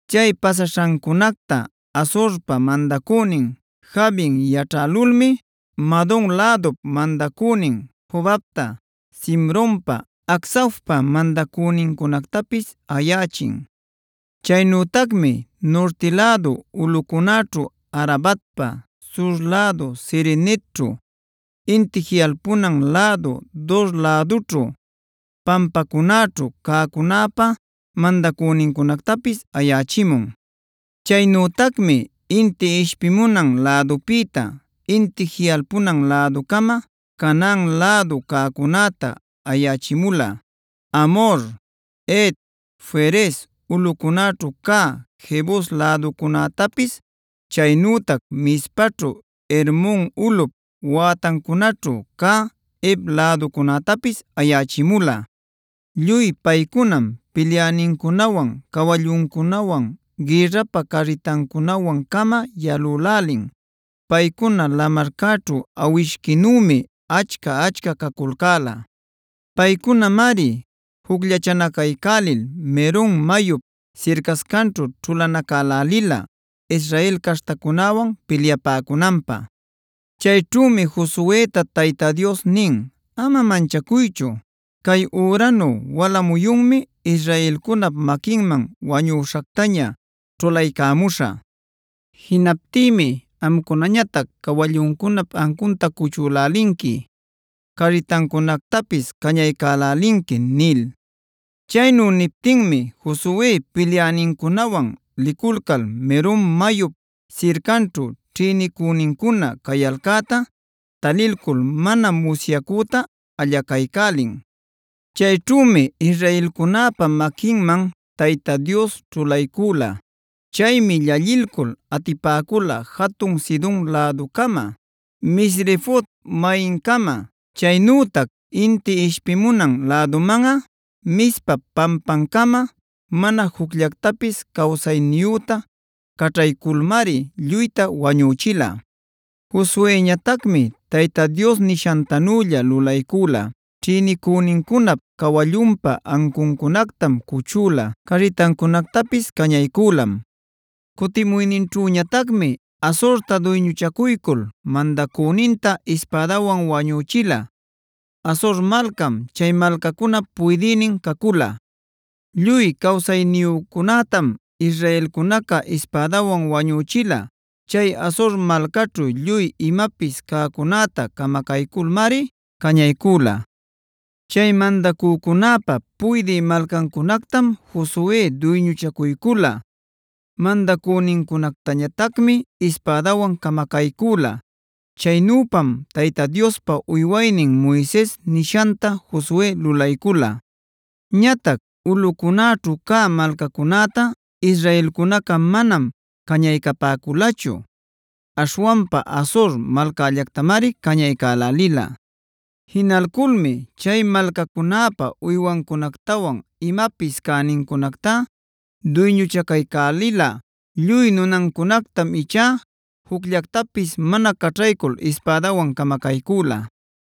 Chay pasaśhancunacta Hazorpa mandacünin Jabin yaćhälulmi Madon lädup mandacünin Jobabta, Simronpa, Acsafpa mandacünincunactapis ayächin. Chaynütacmi nurti lädu ulꞌucunäćhu, Arabatpa sur lädu Cineretćhu, inti jiꞌalpunan lädu Dora lädućhu, pampacunäćhu cäcunäpa mandacünincunactapis ayächimun. Chaynütacmi inti ishpimunan lädupïta, inti jiꞌalpunan läducama Canaan lädu cäcunäta ayächimula: Amhor, Het, Ferez, ulꞌucunäćhu cä Jebus läducunätapis, chaynütac Mizpaćhu Hermon ulꞌup wätancunaćhu cä Hev läducunätapis ayächimula. Lluy paycunam pilyänincunawan, cawalluncunawan, gïrrapä carritancunawan-cama yalülälin. Paycuna lamarcäćhu awishquinümi achca-achca caculcäla. Paycunamari jucllachanacaycälil Merom mayup sircascanćhu ćhulanacälälila Israel caśhtacunäwan pilyapäcunanpä. Chayćhümi Josueta Tayta Dios nin: “Ama manchacuychu, cay üranu wala muyunmi israelcunap maquinman wañüśhactaña ćhulaycamuśhä. Jinaptïmi amcunañatac cawalluncunap ancunta cuchülälinqui, carritancunactapis cañaycälälinqui” nil. Chaynu niptinmi Josue pilyänincunawan liculcal Merom mayup sircanćhu ćhïnicünincuna cayalcäta talilcul mana musyacüta allacaycälin. Chayćhümi israelcunäpa maquinman Tayta Dios ćhulaycüla. Chaymi llallilcul atipäcula jatun Sidonb läducama, Misrefot-maimcama, chaynütac inti ishpimunan lädumanꞌa Mizpap pampancama. Mana jucllactapis cawsayniyüta caćhayculmari lluyta wañüchila. Josueñatacmi Tayta Dios nishantanülla lulaycula: ćhïnicünincunap cawallunpa ancuncunactam cuchüla, carritancunactapis cañaycülam. Cutimuyninćhüñatacmi Hazorta duyñuchacuycul mandacüninta ispädawan wañüchila. Hazor malcam chay malcacunap puydïnin cacula. Lluy cawsayniyücunätam israelcunaca ispädawan wañüchila. Chay Hazor malcaćhu lluy imapis cäcunäta camacayculmari cañaycüla. Chay mandacücunäpa puydï malcancunactam Josue duyñuchacuycula. Mandacünincunactañatacmi ispädawan camacaycüla. Chaynüpam Tayta Diospa uywaynin Moises nishanta Josue lulaycula. Ñatac ulꞌucunäćhu cä malcacunätá israelcunaca manam cañaycapäculachu; aśhwanpa Hazor malcällactamari cañaycälälila. Jinalculmi chay malcacunäpa uywancunactawan imapis cänincunacta duyñuchacaycälila. Lluy nunancunactam ichá jucllactapis mana caćhaycul ispädawan camacaycüla.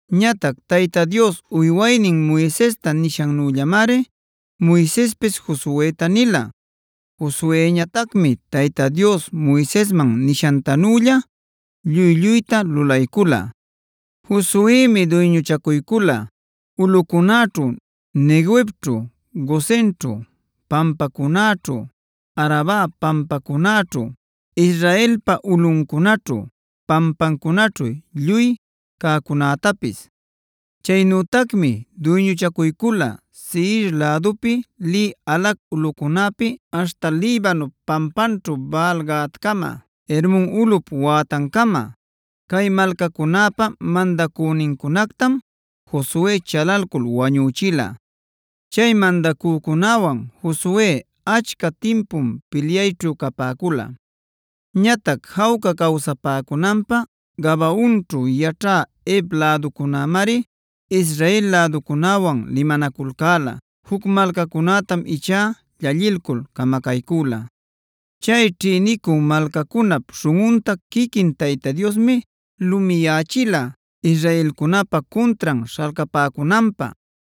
Ñatac Tayta Dios uywaynin Moisesta nishannüllamari Moisespis Josueta nila. Josueñatacmi Tayta Dios Moisesman nishantanülla lluy-lluyta lulaycula. Josuemi duyñuchacuycula: ulꞌucunäćhu, Neguevćhu, Gosenćhu, pampacunäćhu, Araba pampacunäćhu, Israelpa ulꞌuncunaćhu pampancunaćhu lluy cäcunätapis. Chaynütacmi duyñuchacuycula Seir lädupi lï Halac ulꞌucunäpi aśhta Libanop pampanćhu Baal-gaadcama, Hermon ulꞌup wätancama. Cay malcacunäpa mandacünincunactam Josue chalalcul wañüchila. Chay mandacücunäwan Josue achca timpum pilyayćhu capäcula. Ñatac jawca cawsapäcunanpä Gabaonćhuc yaćhä Hev läducunämari Israel läducunäwan limanaculcäla. Juc malcacunätam ichá llallilcul camacaycüla. Chay ćhïnicü malcacunap śhunꞌunta quiquin Tayta Diosmi lumiyächila israelcunäpa cuntran śhalcapäcunanpä.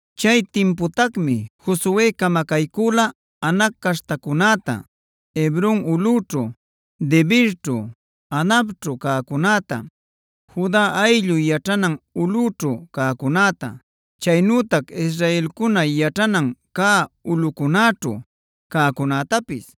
Chay timputacmi Josue camacaycüla Anac caśhtacunäta, Hebron ulꞌüćhu, Debirćhu, Anabćhu cäcunäta, Juda ayllu yaćhanan ulꞌüćhu cäcunäta, chaynütac israelcuna yaćhanan cä ulꞌucunäćhu cäcunätapis.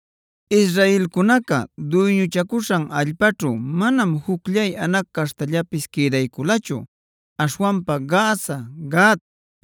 Israelcunaca duyñuchacuśhan allpaćhu manam jucllay Anac caśhtallapis quïdayculachu. Aśhwanpa Gaza, Gat,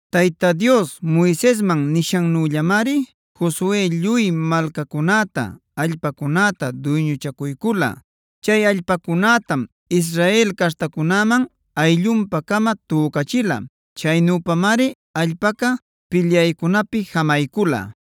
Tayta Dios Moisesman nishanmannüllamari Josue lluy malcacunäta, allpacunäta duyñuchacuycula. Chay allpacunätam Israel caśhtacunäman ayllunpa-cama tücachila. Chaynüpamari allpaca pilyaycunapi jamaycula.